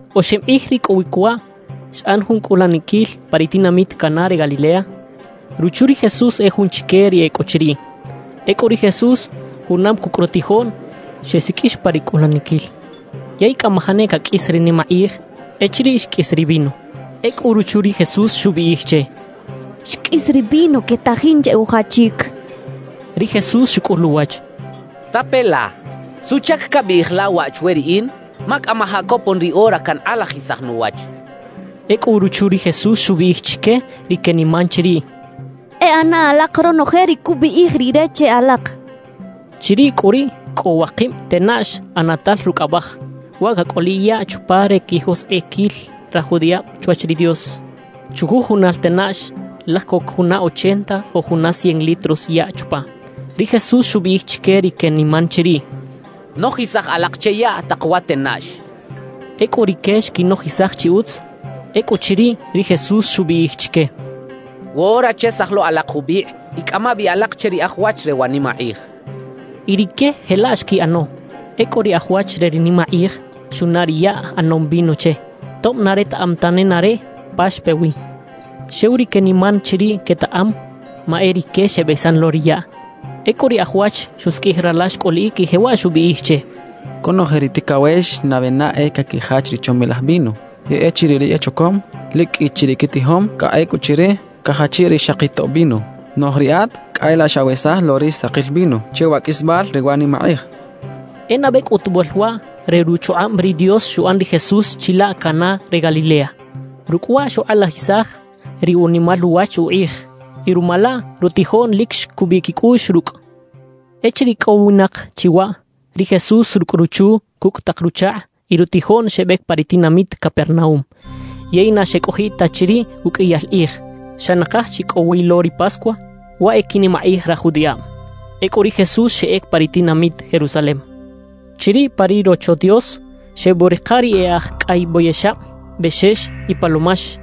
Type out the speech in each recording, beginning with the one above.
Oxib kꞌij ricꞌowic waꞌ, xꞌan jun cꞌulaniquil pa ri tinamit Caná re Galilea. Ruchu ri Jesús e jun chique ri e cꞌo chiriꞌ. Ecꞌu ri Jesús, junam cucꞌ rutijoꞌn, xesiqꞌuix pa ri cꞌulaniquil. Yey cꞌamajaꞌ ne caqꞌuis ri nimakꞌij echiriꞌ xqꞌuis ri vino. Ecꞌu ruchu ri Jesús xubiꞌij che: —Xqꞌuis ri vino quetajin che ujachic —xchaꞌ. Ri Jesús xucꞌul uwach: —Tape la, ¿suꞌchac cabiꞌij la waꞌ chwe riꞌin? Ma cꞌamajaꞌ copon ri ora cankꞌalajisaj nuwach —xchaꞌ. Ecꞌu ruchu ri Jesús xubiꞌij chique ri queniman chiriꞌ: —E ꞌana alak ronoje ri cubiꞌij rire che alak —xchaꞌ. Chiriꞌ cꞌu riꞌ cꞌo wakib tenaꞌx ꞌanatal rucꞌ abaj, waꞌ cacꞌoliꞌ yaꞌ chupa re quijoskꞌiquil raj judiꞌab chwach ri Dios. Chujujunal tenaꞌx, laj coc juna ochenta o juna cien litros yaꞌ chupa. Ri Jesús xubiꞌij chique ri queniman chiriꞌ: —Nojisaj alak che yaꞌ tak wa tenaꞌx —xchaꞌ. Ecꞌu rique xquinojisaj chi utz. Ecꞌuchiriꞌ, ri Jesús xubiꞌij chique: —Woꞌora chesaj lo alak jubikꞌ y cꞌama bi alak che ri aj wach re wa nimakꞌij —xchaꞌ. Y rique jelaꞌ xquiꞌano. Ecꞌu ri aj wach re ri nimakꞌij xunaꞌ ri yaꞌ ꞌanom vino che, tob na retaꞌam ta nenareꞌ pa xpe wi. Xew ri queniman chiriꞌ quetaꞌam, ma e rique xebesan lo ri yaꞌ. Ecꞌu ri aj wach xusiqꞌuij rala xcꞌuliꞌic y jewaꞌ xubiꞌij che: —Conoje ri ticawex nabe na e caquijach ri chomilaj vino, yey echiriꞌ ri echocom lic qꞌui chi ri quitijom, cꞌa ecꞌuchiriꞌ cajachiꞌ ri xaki tob vino. Noꞌj riꞌat cꞌa e laꞌ xawesaj lo ri sakil vino che wa qꞌuisbal re wa nimakꞌij —xchaꞌ. E nabe cꞌutubal waꞌ re ruchukꞌab ri Dios xuꞌan ri Jesús chilaꞌ Caná re Galilea. Rucꞌ waꞌ xukꞌalajisaj ri unimal uwach ukꞌij y ruma laꞌ rutijoꞌn lic xcubiꞌ quicꞌuꞌx rucꞌ. Echiriꞌ icꞌowinak chi waꞌ, ri Jesús rucꞌ ruchu, cucꞌ tak ruchakꞌ y rutijoꞌn xebec pa ri tinamit Capernaúm. Yey na xecꞌojiꞌ ta chiriꞌ uqꞌuiyal kꞌij. Xa nakaj chi cꞌo wi lo ri Pascua, waꞌ e quinimakꞌij raj judiꞌab. Ecꞌu ri Jesús xeꞌec pa ri tinamit Jerusalem. Chiriꞌ pa ri Rocho Dios, xebuꞌrika ri e aj cꞌay boyexab, bexex y palomax,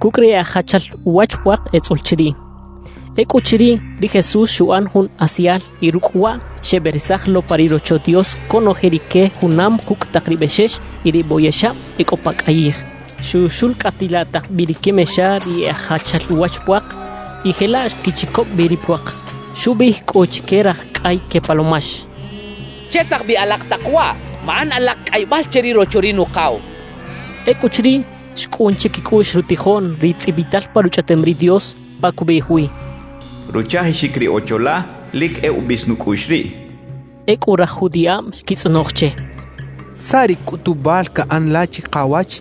cucꞌ ri e aj jachal uwach puak etzꞌul chiriꞌ. Ecꞌuchiriꞌ, ri Jesús xuꞌan jun asial y rucꞌ waꞌ xeberesaj lo pa ri Rocho Dios conoje rique junam cucꞌ tak ri bexex y ri boyexab e cꞌo pa cꞌayij. Xuxulcꞌatilaꞌ tak bi ri quimexa ri e aj jachal uwach puak, y jelaꞌ xquichicoꞌb bi ri puak. Xubiꞌij cꞌu chique raj cꞌay que palomax: —¡Chesaj bi alak tak waꞌ! ¡Maꞌan alak cꞌaybal che ri Rocho ri Nukaw! —xchaꞌ. Ecꞌuchiriꞌ, xcꞌun chiquicꞌuꞌx rutijoꞌn ri tzꞌibital pa Ruchꞌaꞌtem ri Dios pa cubiꞌij wi: Ruchajixic ri Ocho la lic e ubis nucꞌuꞌx riꞌ cachaꞌ. Ecꞌu raj judiꞌab xquitzꞌonoj che: —¿Saꞌ ri cꞌutubal caꞌan la chikawach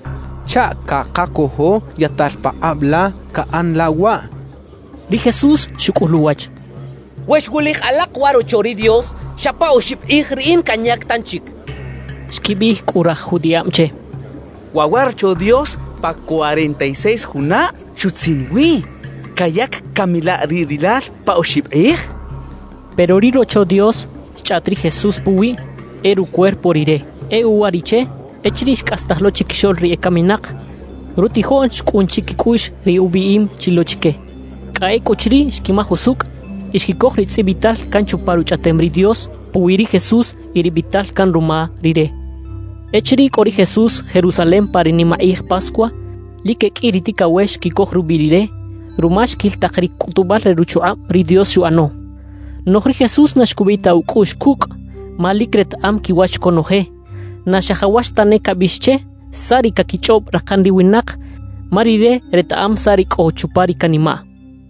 chaꞌ cakacojo yaꞌtal pakꞌab la caꞌan la waꞌ? —xechaꞌ. Ri Jesús xucꞌul uwach: —We xwulij alak wa rocho ri Dios, xa pa oxib kꞌij riꞌin canyac tanchic —xchaꞌ. Xquibiꞌij cꞌu raj judiꞌab che: —Waꞌ wa Rocho Dios pa cuarenta y seis junab xutzin wi. ¿Cayac cami la riꞌ rilal pa oxib kꞌij? —xechaꞌ. Pero ri “Rocho Dios” xchꞌaꞌt ri Jesús puwiꞌ, e rucuerpo Rire. E uwariꞌche, echiriꞌ xcꞌastaj lo chiquixoꞌl ri ecaminak, rutijoꞌn xcꞌun chiquicꞌuꞌx ri ubiꞌim chi lo chique. Cꞌa ecꞌuchiriꞌ xquimaj usucꞌ y xquicoj ri tzꞌibital can chupa Ruchꞌaꞌtem ri Dios puwi ri Jesús y ri biꞌtal can ruma Rire. Echiriꞌ cꞌo ri Jesús Jerusalem pa ri nimakꞌij Pascua, lic e qꞌui ri ticawex xquicoj rubiꞌ Rire ruma xquil tak ri cꞌutubal re ruchukꞌab ri Dios xuꞌano. Noꞌj ri Jesús na xcubiꞌ ta ucꞌuꞌx cucꞌ ma lic retaꞌam quiwach conoje. Na xajawax tane cabiꞌx che saꞌ ri caquichꞌob rakan ri winak, ma Rire retaꞌam saꞌ ri cꞌo chupa ri canimaꞌ.